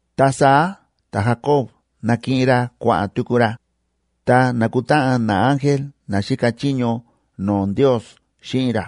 Ta saá ta̱Jacob na̱kiꞌin ra kua̱ꞌa̱n tuku ra, ta na̱kutáꞌan naángel na xíka chiño no̱o̱ Ndios xíꞌin ra.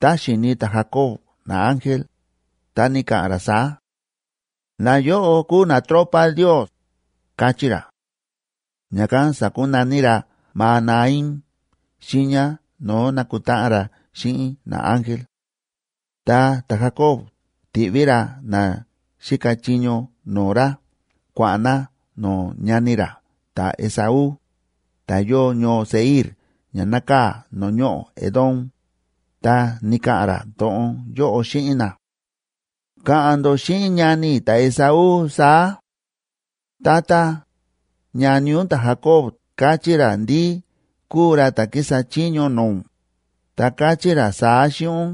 Tá xi̱ni ta̱Jacob naángel, ta ni̱ka̱ꞌa̱n ra saá: “Nayóꞌo kúu natropa Ndios”, káchí ra. Ña̱kán sa̱kunaní ra Mahanaima xiiña no̱o̱ na̱kutáꞌan ra xíꞌin naángel. Ta ta̱Jacob ti̱ꞌví ra na xíka chiño no̱o̱ ra kua̱ꞌa̱n na no̱o̱ ñani ra ta̱Esaú, ta̱ yóo ñoo Seir ña nákaa̱ no̱o̱ ñoꞌo̱ Edom, ta ni̱ka̱ꞌa̱n ra to̱ꞌon yóꞌo xíꞌin na: ―Ka̱ꞌa̱n ndó xíꞌin ñani i̱ ta̱Esaú saá: “Tata, ñani ún ta̱Jacob káchí ra ndí kúu ra ta̱ kísa chiño no̱o̱ ún, ta káchí ra saá xíꞌin ún: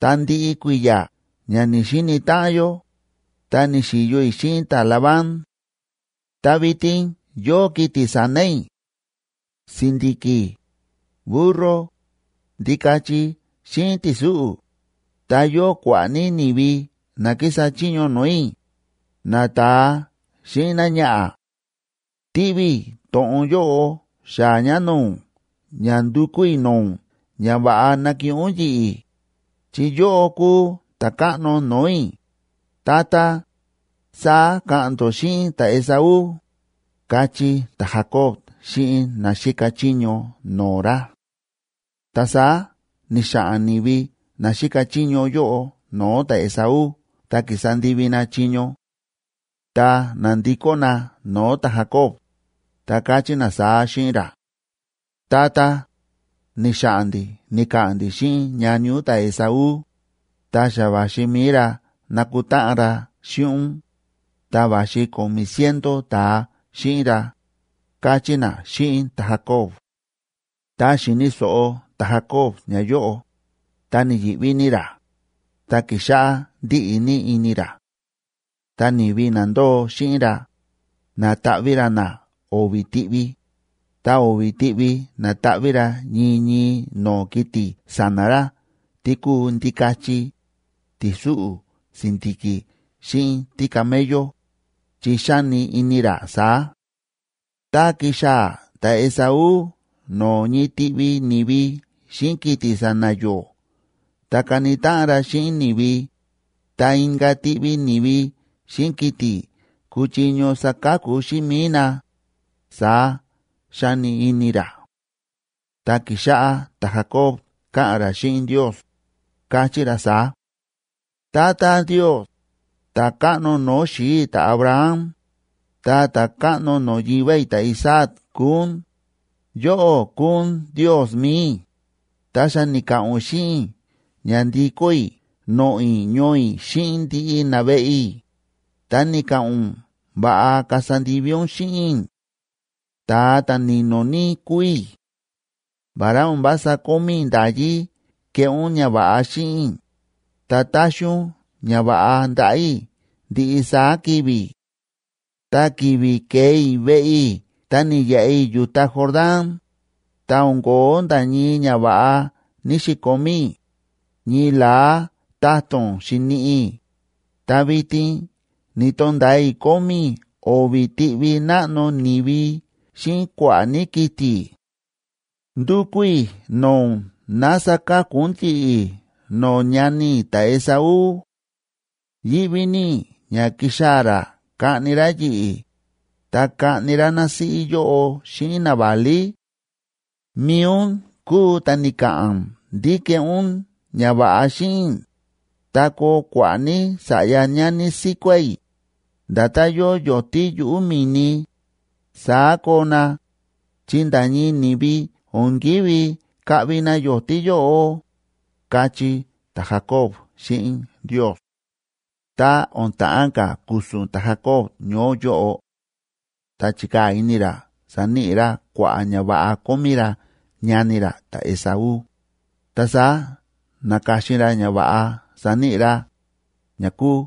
Ta ndiꞌi kui̱ya̱ ña ni̱‑xini táꞌan yó, ta ni̱xi̱yo i̱ xíꞌin ta̱Labán. Ta vitin yóo kiti̱ sa̱na̱ i̱: si̱ndi̱ki̱, burro, ndikachi xíꞌin ti̱súꞌu̱. Ta yóo kua̱ꞌa̱ ní ni̱vi na kísa chiño no̱o̱ i̱, nata̱a xíꞌin náñaꞌa̱. Tíꞌví i̱ to̱ꞌon yóꞌo xaa̱ ña no̱o̱ ún ña ndukú i̱ no̱o̱ ún ña va̱ꞌa nakiꞌin ún yi̱ꞌi̱, chi yóꞌó kúu ta̱káꞌno no̱o̱ i̱, tata”, saá ka̱ꞌa̱n ndó xíꞌin ta̱Esaú ―káchí ta̱Jacob xíꞌin na xíka chiño no̱o̱ ra. Ta saá ni̱xa̱ꞌa̱n ni̱vi na xíka chiño yóꞌo no̱o̱ ta̱Esaú ta ki̱sa ndivi na chiño, ta na̱ndikó na no̱o̱ ta̱Jacob, ta káchí na saá xíꞌin ra: ―Tata, ni̱xa̱ꞌa̱n ndi̱ ni̱ka̱ꞌa̱n ndi̱ xíꞌin ñani ún ta̱Esaú, ta xa va̱xi mi̱i ra nakutáꞌan ra xíꞌin ún, ta va̱xi ko̱mi̱ ciento ta̱a xíꞌin ra ―káchí na xíꞌin ta̱Jacob. Ta xi̱ni̱ so̱ꞌo ta̱Jacob ñayóꞌo, ta ni̱yi̱ꞌví ní ra, ta ki̱xáꞌá ndíꞌi ní ini ra. Ta ni̱vi na ndóo xíꞌin ra, na̱taꞌví ra na o̱vi̱ tiꞌvi, ta o̱vi̱ tiꞌvi na̱taꞌví ra ñii ñii no̱o̱ kiti̱ sa̱na̱ ra tí kúu ndikachi, ti̱súꞌu̱, si̱ndi̱ki̱ xíꞌin tícamello, chi xáni ini ra saá: “Tá kixaa̱ ta̱Esaú no̱o̱ ñii tiꞌvi ni̱vi xíꞌin kiti̱ sa̱na̱ yó ta kani táꞌan ra xíꞌin ni̱vi, ta inka̱ tiꞌvi ni̱vi xíꞌin kiti̱ kuchiño saka̱ku xíꞌin mi̱i na”, saá xáni ini ra. Ta ki̱xáꞌá ta̱Jacob káꞌa̱n ra xíꞌin Ndios, káchí ra saá: ―Tata Ndios, ta̱káꞌno no̱o̱ xi̱i̱ i̱ ta̱Abraham, ta ta̱káꞌno no̱o̱ yivá i̱ ta̱Isaac kúu ún, yóꞌó kúu ún Ndiosb mi̱i i̱, ta xa ni̱ka̱ꞌa̱n ún xíꞌin i̱ ña ndikó i̱ noꞌo̱ i̱ ñoo i̱ xíꞌin ndiꞌi naveꞌe i̱, ta ni̱ka̱ꞌa̱n ún va̱ꞌa kasa ndivi ún xíꞌin i̱; ta̱a ta̱ ni̱no̱ ní kúu i̱; vará o̱n vása kómí i̱ nda̱yí keꞌé ún ñava̱ꞌa xíꞌin i̱, ta táxi ún ñava̱ꞌa ndaꞌa̱ i̱ ndiꞌi saá ki̱vi̱. Ta ki̱vi̱ ke̱e i̱ veꞌe i̱ ta ni̱yaꞌa i̱ yu̱ta Jordán, ta o̱n ko̱ó nda̱ ñii ñava̱ꞌa ní‑xikomí i̱, ñii la̱á ta̱to̱n xi̱niꞌi i̱, ta vitin ni̱to̱nda̱a i̱ kómí i̱ o̱vi̱ tiꞌvi náꞌno ni̱vi xíꞌin kua̱ꞌa̱ ní kiti̱. Ndúkú i̱ no̱o̱ ún ná saka̱ku ún yi̱ꞌi̱ no̱o̱ ñani i̱ ta̱Esaú. Yíꞌví ní i̱ ña kixaa̱ ra kaꞌni ra yi̱ꞌi̱, ta kaꞌni ra násíꞌí yóꞌo xíꞌin naválí. Mi̱i ún kúu ta̱ ni̱ka̱ꞌa̱n ndí keꞌé ún ñava̱ꞌa xíꞌin i̱, ta koo kua̱ꞌa̱ ní sa̱ꞌya ñani síkuá i̱, nda̱tán yóo yo̱tí yuꞌu̱ mi̱ni, saá koo na, chi nda̱ ñii ni̱vi o̱n ki̱ví kaꞌvi na yo̱tí yóꞌo ―káchí ta̱Jacob xíꞌin Ndios. Ta o̱n ta̱ꞌán ka̱ ku̱su̱n ta̱Jacob ñoó yóꞌo, ta chi̱kaa̱ ini ra saníꞌi ra kua̱ꞌa̱ ñava̱ꞌa kómí ra ñani ra ta̱Esaú, ta saá na̱ka̱xin ra ñava̱ꞌa saníꞌi ra, ña kúu: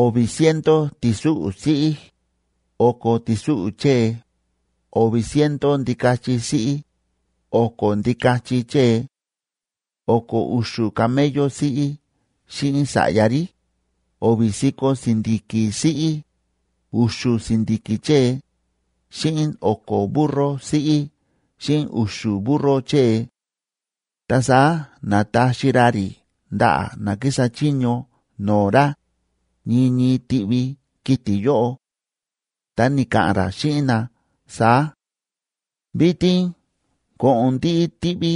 o̱vi̱ ciento ti̱súꞌu̱ siꞌí, o̱ko̱ ti̱súꞌu̱ chée, o̱vi̱ ciento ndikachi siꞌí, o̱ko̱ ndikachi chée; o̱ko̱ u̱xu̱ camello siꞌí xíꞌin sa̱ꞌya rí, o̱vi̱ si̱ko̱ si̱ndi̱ki̱ siꞌí, u̱xu̱ si̱ndi̱ki̱ chée, xíꞌin o̱ko̱ burro siꞌí xíꞌin u̱xu̱ burro chée. Ta saá na̱taxi ra rí ndaꞌa̱ na kísa chiño no̱o̱ ra, ñii ñii tiꞌvi kiti̱ yóꞌo, ta ni̱ka̱ꞌa̱n ra xíꞌin na saá: ―Vitin ko̱ꞌo̱n ndiꞌi tiꞌvi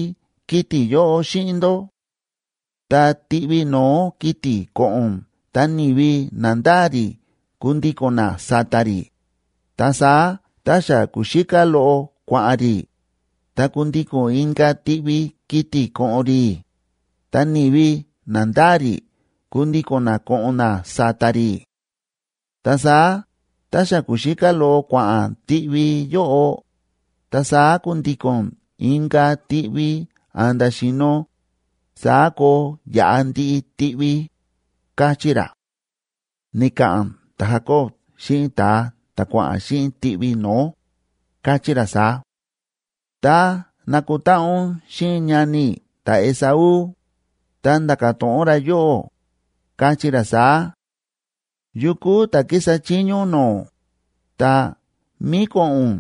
kiti̱ yóꞌo xíꞌin ndó. Ta tiꞌvi no̱ó kiti̱ ko̱ꞌo̱n ta ni̱vi na ndáa rí kundiko̱n na sa̱ta̱ rí, ta saá tá xa ku̱xíká loꞌo kua̱ꞌa̱n rí, ta kundiko̱n inka̱ tiꞌvi kiti̱ ko̱ꞌo̱n rí, ta ni̱vi na ndáa rí kundiko̱n na ko̱ꞌo̱n na sa̱ta̱ rí. Ta saá tá xa ku̱xíká loꞌo kua̱ꞌa̱n tiꞌvi yóꞌo, ta saá kundiko̱n inka̱ tiꞌvi a̱nda̱ xi̱no̱, saá koo yaꞌa ndiꞌi tiꞌvi ―káchí ra. Ni̱ka̱ꞌa̱n ta̱Jacob xíꞌin ta̱a ta̱ kua̱ꞌa̱n xíꞌin tiꞌvi no̱ó, káchí ra saá: ―Tá nakutáꞌan ún xíꞌin ñani i̱ ta̱Esaú, ta nda̱ka̱ to̱ꞌon ra yóꞌó, kachí ra saá: “¿Yukú ta̱ kísa chiño ún no̱o̱?, ta, ¿mí ko̱ꞌo̱n ún?,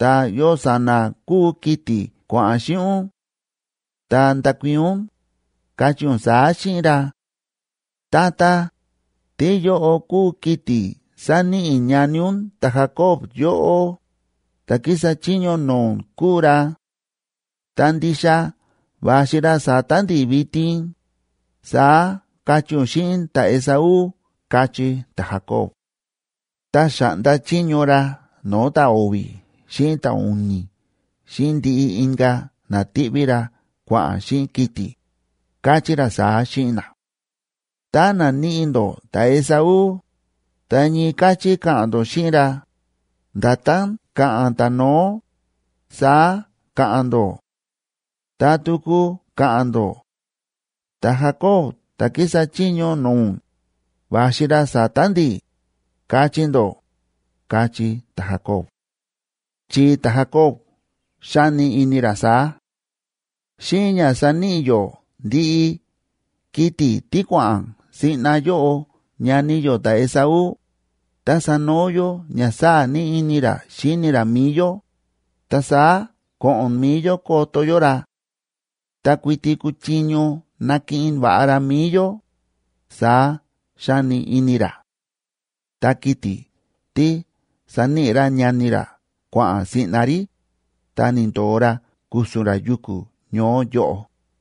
ta, ¿yo sa̱na̱ kúu kiti̱ kua̱ꞌa̱n xíꞌin ún?”, ta ndakuii̱n ún, kachí ún saá xíꞌin ra: “Tata, tíyóꞌo kúu kiti̱ sáníꞌi ñani ún ta̱Jacob yóꞌó, ta̱ kísa chiño no̱o̱ ún kúu ra. Ta ndixa va̱xi ra sa̱ta̱ ndi̱ vitin”, saá kachí ún xíꞌin ta̱Esaú ―káchí ta̱Jacob. Ta xa̱ꞌnda chiño ra no̱o̱ ta̱o̱vi̱ xíꞌin ta̱u̱ni̱ xíꞌin ndiꞌi inka̱ na tíꞌví ra kua̱ꞌa̱n xíꞌin kiti̱, káchí ra saá xíꞌin na: ―Tá naníꞌi ndó ta̱Esaú, ta ñii káchí ka̱ꞌa̱n ndó xíꞌin ra, nda̱tán ka̱ꞌa̱n ta̱no̱ó, saá ka̱ꞌa̱n ndó. Ta tuku ka̱ꞌa̱n ndó: “Ta̱Jacob ta̱ kísa chiño no̱o̱ ún, va̱xi ra sa̱ta̱ ndi̱”, kachí ndó ―káchí ta̱Jacob. Chi ta̱Jacob xáni ini ra saá: “Xíꞌin ña saníꞌi yó ndiꞌi kiti̱ tí kua̱ꞌa̱n siꞌna yóꞌo ñani yó ta̱Esaú, ta sanoo yó ña sáa̱ ní ini ra xíni ra mi̱i yó, ta saá ko̱ꞌo̱n mi̱i yó koto yó ra. Ta kuiti kuchiño nakiꞌin va̱ꞌa ra mi̱i yó”, saá xáni ini ra. Ta kiti̱ tí saníꞌi ra ñani ra kua̱ꞌa̱n siꞌna rí, ta ni̱ndo̱o ra ku̱su̱n ra yuku̱ ñoó yóꞌo.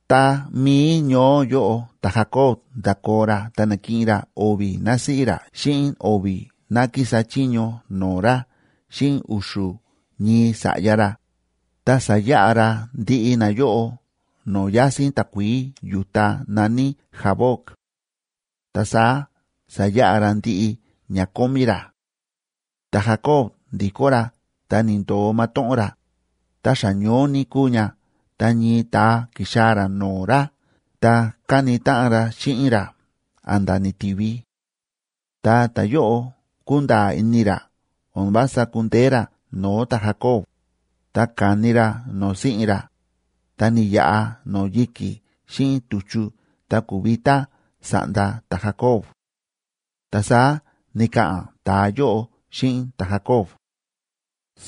Tá mií ñoó yóꞌo ta̱Jacob nda̱koo ra ta na̱kiꞌin ra o̱vi̱ násíꞌí ra xíꞌin o̱vi̱ ná kísa chiño no̱o̱ ra xíꞌin u̱xu̱ ñii sa̱ꞌya ra, ta sa̱yaꞌa ra ndiꞌi nayóꞌo no̱o̱ yásín takuií yu̱ta na̱ní Jaboc. Ta saá sa̱yaꞌa ra ndiꞌi ña kómí ra. Ta̱Jacob ndi̱kó ra ta ni̱ndo̱o matóꞌón ra, ta xa ñoó ní kúu ña ta ñii ta̱a ki̱xaa̱ ra no̱o̱ ra ta káni táꞌan ra xíꞌin ra a̱nda̱ ni̱ti̱vi. Tá ta̱yóꞌo kúnda̱a̱ ini ra o̱n vása kundeé ra no̱o̱ ta̱Jacob, ta ka̱ni ra no̱o̱ si̱ꞌin ra, ta ni̱yaꞌa no̱o̱ yi̱ki̱ xíꞌin tu̱chu ta ku̱vitá sa̱ꞌnda ta̱Jacob. Ta saá ni̱ka̱ꞌa̱n ta̱a yóꞌo xíꞌin ta̱Jacob: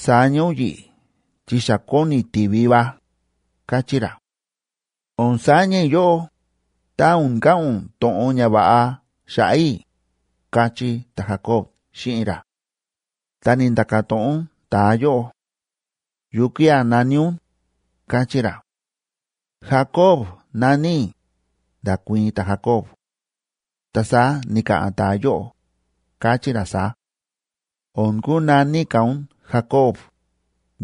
―Saña ún yi̱ꞌi̱ chi xa kóni ti̱vi va ―káchí ra. ―O̱n saña i̱ yóꞌó, tá o̱n ka̱ꞌa̱n ún to̱ꞌon ñava̱ꞌa xa̱ꞌa̱ i̱ ―káchí ta̱Jacob xíꞌin ra. Ta ni̱nda̱ka̱ to̱ꞌon ta̱a yóꞌo: ―¿Yukía̱ na̱ní ún? ―káchí ra. ―Jacob na̱ní i̱ ―nda̱kuii̱n ta̱Jacob. Ta saá ni̱ka̱ꞌa̱n ta̱a yóꞌo, káchí ra saá: ―O̱n kunaní ka̱ ún Jacob,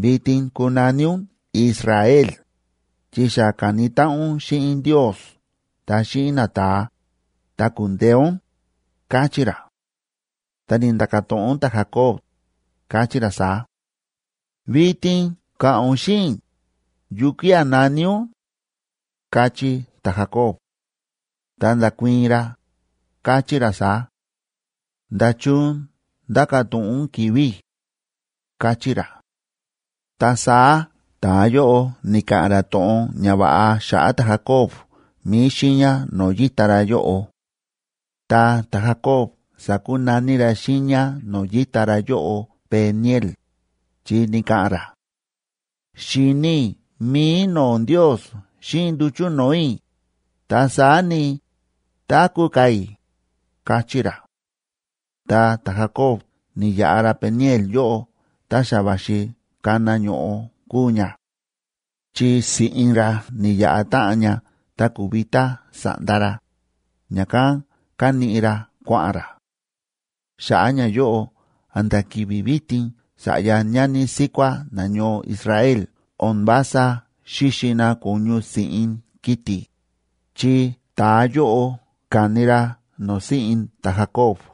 vitin kunaní ún Israel,c chi xa ka̱ni táꞌan ún xíꞌin Ndios ta xíꞌin nata̱a, ta ku̱ndeé ún ―káchí ra. Ta ni̱nda̱ka̱ to̱ꞌon ta̱Jacob, káchí ra saá: ―Vitin ka̱ꞌa̱n ún xíꞌin i̱, ¿yukía̱ na̱ní ún? ―káchí ta̱Jacob. Ta nda̱kuii̱n ra, káchí ra saá: ―¿Nda̱chun ndáka̱ to̱ꞌon ún ki̱vi̱ i̱? ―káchí ra. Ta saá ta̱a yóꞌo ni̱ka̱ꞌa̱n ra to̱ꞌon ñava̱ꞌa xa̱ꞌa̱ ta̱Jacob mi̱i xiiña no̱o̱ yíta ra yóꞌo. Ta ta̱Jacob sa̱kunaní ra xiiña no̱o̱ yíta ra yóꞌo Peniel,d chi ni̱ka̱ꞌa̱n ra: “Xi̱ni i̱ mi̱i no̱o̱ Ndios xíꞌin nduchu̱ no̱o̱ i̱, ta saá ni, táku̱ ka̱ i̱”, káchí ra. Tá ta̱Jacob ni̱yaꞌa ra Peniel yóꞌo ta xa va̱xi kana ño̱ꞌo kúu ña. Chi si̱ꞌin ra ni̱yaꞌa táꞌan ña ta ku̱vitá sa̱ꞌnda ra, ña̱kán káníꞌi ra kua̱ꞌa̱n ra. Xa̱ꞌa̱ ñayóꞌo a̱nda̱ ki̱vi̱ vitin sa̱ꞌya ñani síkuá nañoo Israel o̱n vása xíxi na ko̱ñu si̱ꞌin kiti̱, chi ta̱a yóꞌo ka̱ni ra no̱o̱ si̱ꞌin ta̱Jacob.